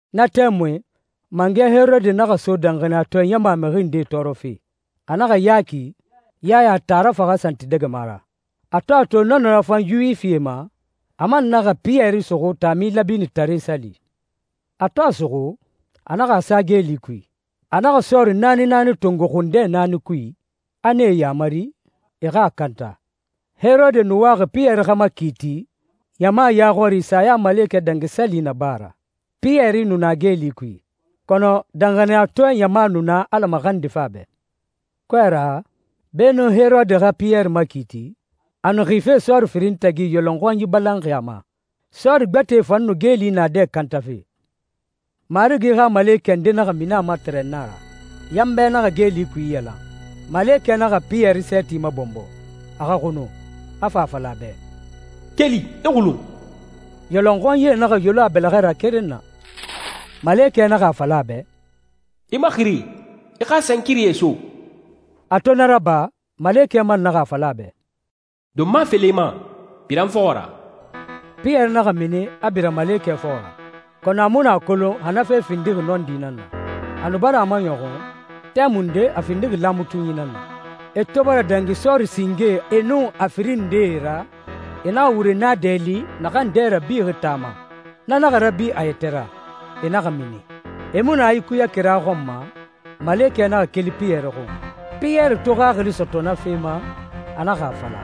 Na tɛmui mangɛ Herode naxa so danxaniyatɔɛ ɲama mixi ndee tɔɔrɔfe. A naxa Yaki, Yaya taara, faxa santidɛgɛma ra. A to a to na nu rafan Yuwifie ma, a man naxa Piyɛri suxu Taami Lɛbinitare Sali. A to a suxu, a naxa a sa geeli kui. A naxa sɔɔri naani naani tongo xundɛ naani kui, a nee yamari, e xa a kanta. Herode nu waxi Piyɛri xa makiiti ɲama ya xɔri Sayamalekɛ Dangi Sali na ba a ra. Piyɛri nu na geeli kui, kɔnɔ danxaniyatɔɛ ɲama nu na Ala maxandife a bɛ. Kɔɛ ra, beenun Herode xa Piyɛri makiiti, a nu xife sɔɔri firin tagi, yɔlɔnxɔnyi balanxi a ma. Sɔɔri gbɛtɛe fan nu geeli naadɛ kantafe. Marigi xa malekɛ nde naxa mini a ma tɛrɛnna ra. Yanbɛ naxa geeli kui iyalan. Malekɛ naxa Piyɛri sɛɛti mabɔnbɔ, a xa xunu, a fa a fala a bɛ, «Keli, i xulun!» Yɔlɔnxɔnyie naxa yolon a bɛlɛxɛ ra keren na. Malekɛ naxa a fala a bɛ, «I maxiri, i xa sankirie so.» A to na raba, malekɛ man naxa a fala a bɛ, «Donma felen i ma, bira n fɔxɔ ra.» Piyɛri naxa mini, a bira malekɛ fɔxɔ ra, kɔnɔ a mu a kolon xa na fe findixi nɔndi nan na. A nu bara a maɲɔxun, tɛmunde a findixi laamatunyi nan na. E to bara dangi sɔɔrie singe e nun a firin ndee ra, e naxa wure naadɛ li naxan dɛ rabixi taa ma, na naxa rabi a yɛtɛ ra. E naxa mini. E mu nu a ikuyaxi kira xɔn ma, malekɛ naxa keli Piyɛri xun. Piyɛri to xaxili sɔtɔ na fe ma, a naxa a fala,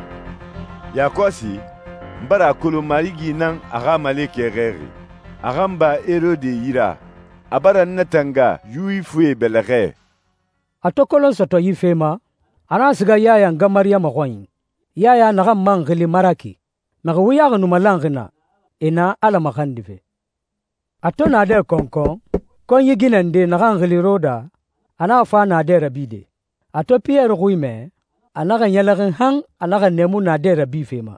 «Yakɔsi, n bara a kolon Marigi nan a xa malekɛ xɛɛxi, a xa n ba Herode yi ra. A bara n natanga Yuwifie bɛlɛxɛ.» A to kolon sɔtɔ yi fe ma, a naxa siga Yaya nga Mariyama xɔnyi, Yaya naxan man xili Maraki. Mixi wuyaxi nu malanxi naa, e na Ala maxandife. A to naadɛ kɔnkɔn, konyi ginɛ nde, naxan xili Roda, a naxa fa naadɛ rabide. A to Piyɛri xui mɛ, a naxa ɲɛlɛxin han a naxa nɛɛmu naadɛ rabife ma.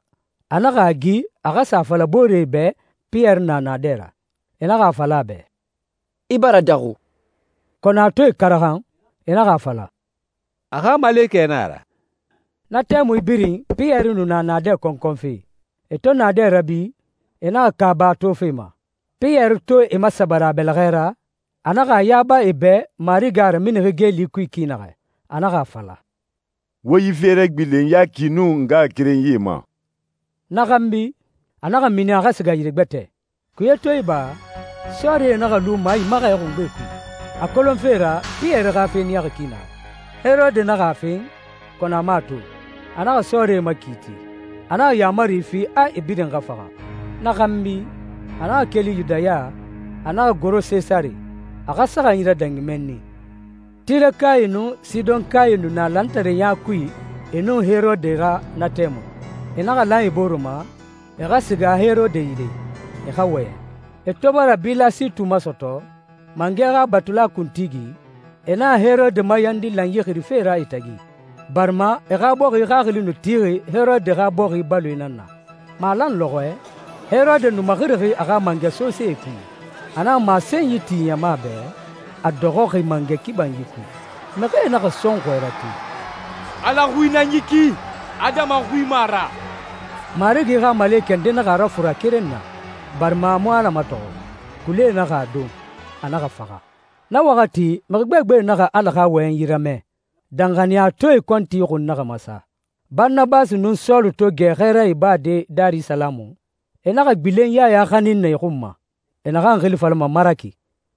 A naxa a gi a xa sa a fala booree bɛ Piyɛri na naadɛ ra. E naxa a fala a bɛ, «I bara daxu.» Kɔnɔ a to e karaxan, e naxa a fala, «A xa malekɛ na a ra.» Na tɛmui birin Piyɛri nu na naadɛ kɔnkɔnfe. E to naadɛ rabi, e naxa kaaba a tofe ma. Piyɛri to e masabari a bɛlɛxɛ ra, a naxa a yaba e bɛ Marigi a raminixi geeli kui ki naxɛ. A naxa a fala, «Wo yi fe ragbilen Yaki nun ngaxakerenyie ma.» Na xanbi, a naxa mini, a xa siga yire gbɛtɛ. Kuye to iba, sɔɔrie naxa lu maimaxɛ xungbe kui, a kolonfe ra Piyɛri xa fe niyaxi ki naxɛ. Herode naxa a fen, kɔnɔ a mu a to. A naxa sɔɔrie makiiti, a naxa yaamari fi a e birin xa faxa. Na xanbi, a naxa keli Yudaya, a naxa goro Sesare, a xa saxanyi radangi mɛnni. Tirekae nun Sidɔnkae nu na lantareya kui e nun Herode ra na tɛmui. E naxa lan e bore ma, e xa siga Herode yire, e xa wɔyɛn. E to bara Bilasitu masɔtɔ, mangɛ xa batula kuntigi, e naxa Herode mayandi lanyi xirife ra e tagi, barima e xa bɔxi xaxili nu tixi Herode xa bɔxi baloe nan na. Malan lɔxɔɛ, Herode nu maxirixi a xa mangɛ sosee kui, a naxa masenyi ti ɲama bɛ, a dɔxɔxi mangɛ kibanyi kui. Mixie naxa sɔnxɔɛ rate, «Ala xui nan yi ki, adama xui mu a ra.» Marigi xa malekɛ nde naxa a rafura keren na, barima a mu Ala matɔxɔ. Kulie naxa a don, a naxa faxa. Na waxati mixi gbegbe naxa Ala xa wɔyɛnyi ramɛ, danxaniyatɔɛe kɔnti xun naxa masa. Baranabasi nun Sɔlu to gɛ xɛɛra ibade Darisalamu, e naxa gbilen Yaya xanin na e xun ma, e naxan xili falama Maraki.